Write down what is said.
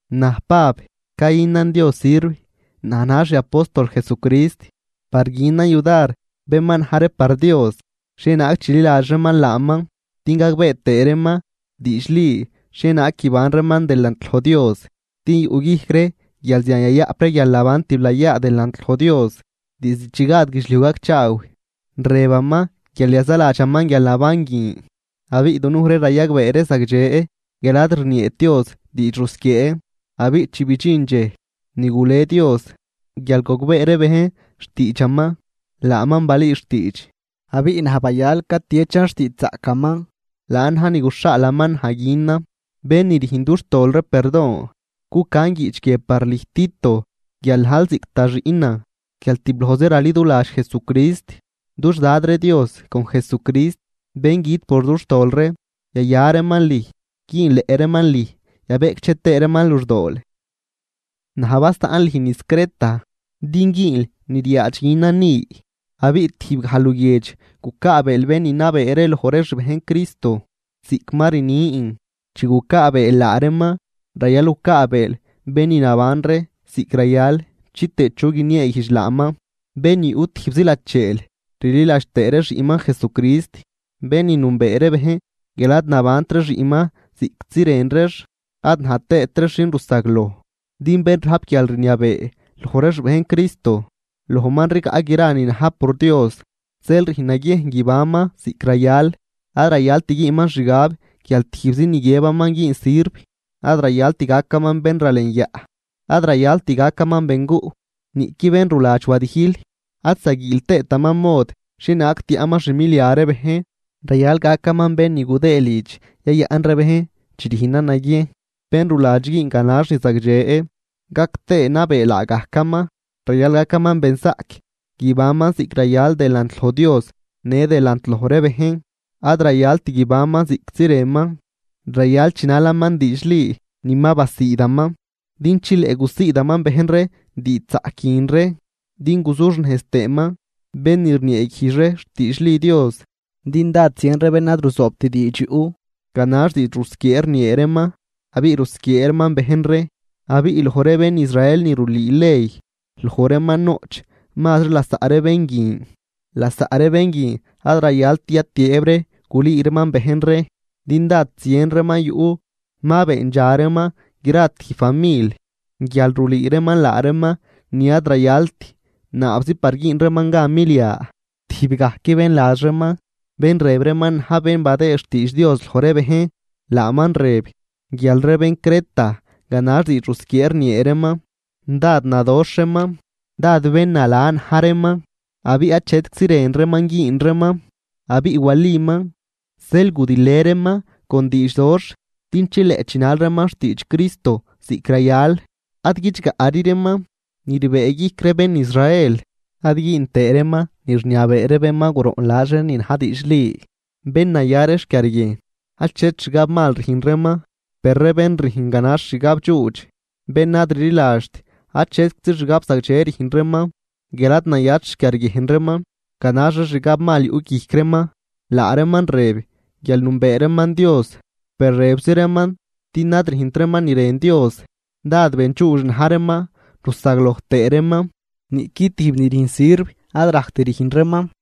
Naj Pab cayünan Dios sirv, naj najn xiapóstol Jesucrist par günan yudar bén ma na̱j ree par Dios xhienaag chililadx reeman laaman din gagbee tëë reeman diidxli xhienaag guiban reeman delant loj Dios, din yuꞌguijc ree guial zian yayaꞌp ree guialnaban tiblayaa delant loj Dios. Diizd chi gad guidxliuj gacchaaw, rëbaman guial yazaladxaman guialnaban guin, abiꞌ dunuj ree rayagbee ree zagdxe guial ad rnieet Dios diidx rusquiee. Abiꞌ chi bidxin dxej ni gule Dios guial gogbee ree bejn xtiidxaman laaman balüü xtiidx, abiꞌ naj bayal catiechan xtiidxzaꞌcaman laan na̱j ni guxhaalaman naj günan, bén ni rüjn dux tol ree perdon. Cucan guiꞌch guie par lüj, Tito, guial najl ziꞌc da xiꞌnan guial tiblojzi raliduladx Jesucrist. Dux Dad ree Dios con Jesucrist bén güt por dux tol ree, yaya reeman lüj, güünleꞌ reeman lüj yabeꞌcdxe tëë reeman luxdool. Naj basaꞌn lüj niz Creta din güünl ni ryaadx günan ni. Abiꞌ tijbgaj luguiedx gucaabeel bén ni nabee ree loj ree xbejn Cristo ziꞌc ma rnin. Chi gucaabeel laa reeman rayal gucaabeel bén ni naban ree ziꞌc rayal chitëë chu guinieeguijdx laaman, bén ni yuꞌ tijbzi lacheel, rliladx tëë ree xiꞌnman Jesucrist, bén ni nünbee ree bejn guial ad nabant ree xiꞌnman ziꞌctzi rën reex ad najt tëët reex xin rusagloj. Din bén rajp guialrniabee loj ree xbejn Cristo, lojman rigaꞌ gra ni na̱j por Dios, zeel rüjn naguiejn guibanman ziꞌc rayal. Ad rayalt güünman xgab guial tijbzi ni guiëbaman güün sirv, ad rayalt gacaman bénralenyaꞌ, ad rayalt gacaman benguꞌ, niꞌqui ben ruladx wadijl, ad zaguiil tëëtaman mod xhienaag tiaꞌman xmilia ree bejn. Rayal gacaman bén ni gudëë lidx yayaꞌn ree bejn chi rüjnan naguiejn, bén ruladx güün ganax ni zagdxe, gac tëë nabee laagajcaman. Rayal gacaman benzaꞌc, guibanman ziꞌc rayal delant loj Dios në delant loj ree bejn, ad rayalt guibanman ziꞌctzi rënman. Rayal chinalaman diidxli ni ma basiidaman, din chileꞌ gusiidaman bejn ree diidxzaꞌc guin ree din guzuxnejz tëëman bén ni rnieeguijdx ree xtiidxli Dios. Din dád zien ree bén ad ruzoobt diidx yuꞌ. Ganax diidx rusquiee rniee reeman abiꞌ rusquiee reeman bejn ree, abiꞌ loj ree bén Israel ni rulüü ley loj reeman noꞌch mazri lasaꞌ ree ben guin. Lasaꞌ ree bén guin ad rayaltri yatiëëb ree gulüü reeman bejn ree, din dád zien ree yu ma beendxa reeman gra tijb famil guial rulüü reeman laa reeman ni ad rayalt naabzi par güün reeman gan milia. Tijb gajc bén ladx reeman bén rëb reeman na̱j bén badëë xtiidx Dios loj ree bejn, laaman rëb guial ree bén Creta ganax diidx rusquiee rniee reeman, dád nadoxh reeman, dád bén nala na̱j reeman abiꞌ achetczi rën reeman güün reeman. Abiꞌ waliman, zeel gudilë reeman con diidxdoxh din chileꞌ chinal reeman xtiidx Cristo ziꞌc rayal, ad guidxgaꞌri reeman ni rbëëguijc ree bén Israel, ad güün teë reeman ni rniabee ree bén ni ma guroꞌnladx ree ni na̱j diidxli. Bén naya ree xquiarguiejn, achet xgab mal rüjn reeman. Per ree bén rüjn ganax xgabdxuudx, bén ad rliladxt, achetczi xgab zagdxe rüjn reeman guial ad nayat xquiarguiejn reeman, ganax ree xgab mal yuꞌ guijc reeman. Laa reeman rëb guial nünbee reeman Dios, per rëbzi reeman din ad rüjnt reeman ni rën Dios. Dád bendxuudx na̱j reeman rusagloj tëë reeman, niꞌqui tijb ni rüjn sirv ad rajct rüjn reeman.